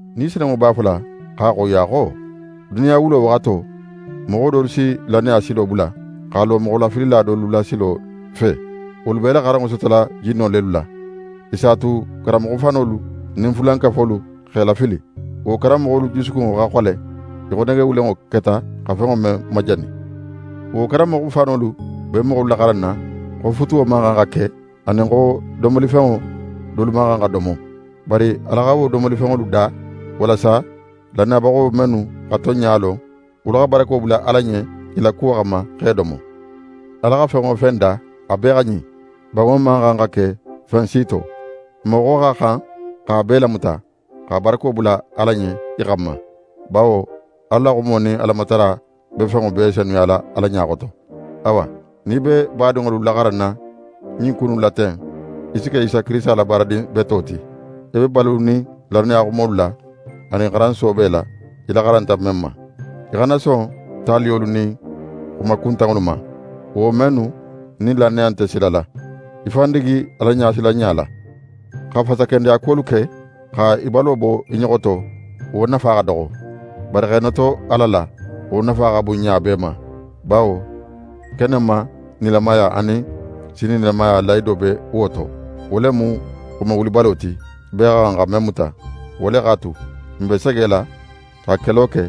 Ni Senunŋo b'a fola x'a xoyiya xo: Duniya wulo waxato, moxo dolu si lannaya silo bula, x'a lo moxolafilila dolu la silo fe. Wolu b'e la xaranŋo sotola jinno lelu la. I s'a tu karanmoxo fanolu nin fulankafolu x'e lafili. Wo karanmoxolu jusukunŋo xa xole, í xo nege wulenŋo keta xa fenŋo men majani. Wo karanmoxolu be moxolu laxaranna xo futuwo man xan xa ke, anin xo domolifenŋo dolu man xan xa domo. Bari Ala xa wo domolifenŋolu da, walasa lannayabaxo mennu xa tonɲa lon, wolu xa barako bula Ala ɲen i la kuwo xanma, x'e domo. Ala xa fen wo fen da, a bee xa ɲin. Banŋo man xan xa ke fen si to. Moxo xa xan x'a bee lamuta, xa barako bula Ala ɲen i xanma. Bawo Ala la xumo nin Alamatara be fenŋo bee senuyala Ala ɲa xoto. Awa, nin í be badinŋolu laxaranna ɲin ku innu la ten, í si ke Isa Kirisita la baaradin beto ti. Í be balunin lannaya xumolu la, anin xaran soobe la, í laxaranta men ma. Í xana son taliyolu nin xuma kuntanŋolu ma, wo mennu nin lannaya nte sila la. Í fan digi Alaɲasilanɲa la. Xa fasakendeya kuwolu ke, xa í balo bo i ɲoxo to, wo nafa xa doxo. Bari x'é noto Ala la, wo nafa xa bun ɲa bee ma; bawo kenenma nilamaya anin sinin nilamaya lahido be wo to. Wo le mu xuma wulibalo ti, bee xa xan xa men muta. Wo le x'a tu, n be segela, xa kelo ke,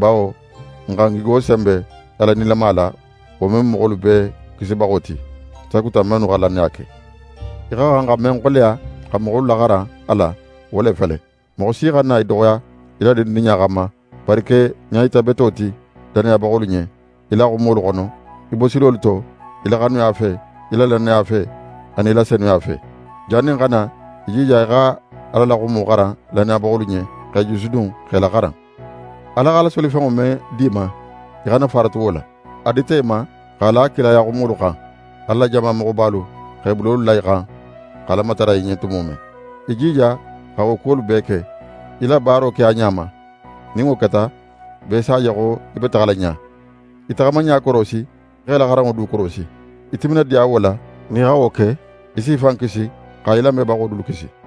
bawo n xa n gigo senbe Ala nilama la, wo men mu moxolu bee Kisibaxo ti, sakuta mennu xa lannaya ke. Í xa xan xa men xoleya, xa moxolu laxaran a la, wo le fele. Moxo si xana í doxoya í la dindinɲa xanma; bari ke ɲayita beto ti lannayabaxolu ɲen, í la xumolu xono, í bosilolu to, í la xanuya fe, í la lannaya fe, anin i la senuya fe. Jannin ń xa na, í jija xa Ala la xumo xaran lannayabaxolu ɲen, x'e jusudun, x'e laxaran. Ala x'a la solifenŋo men di í ma, í xana faratu wo la. A dita í ma, x'a la kilaya xumolu xan, Ala la jama moxobalu x'e bulolu la í xan xa Ala matara í ɲen tumo men. Í jija xa wo kuwolu bee ke. Í la baaro ke a ɲa ma. Nin wo keta, bee s'a je xo í be taxala ɲa. Í taxamaɲa korosi, x'é la xaranŋo du korosi. Í timinadiya wo la. Nin í xa wo ke, í s'í fan kisi, xa í lamebaxo dulu kisi.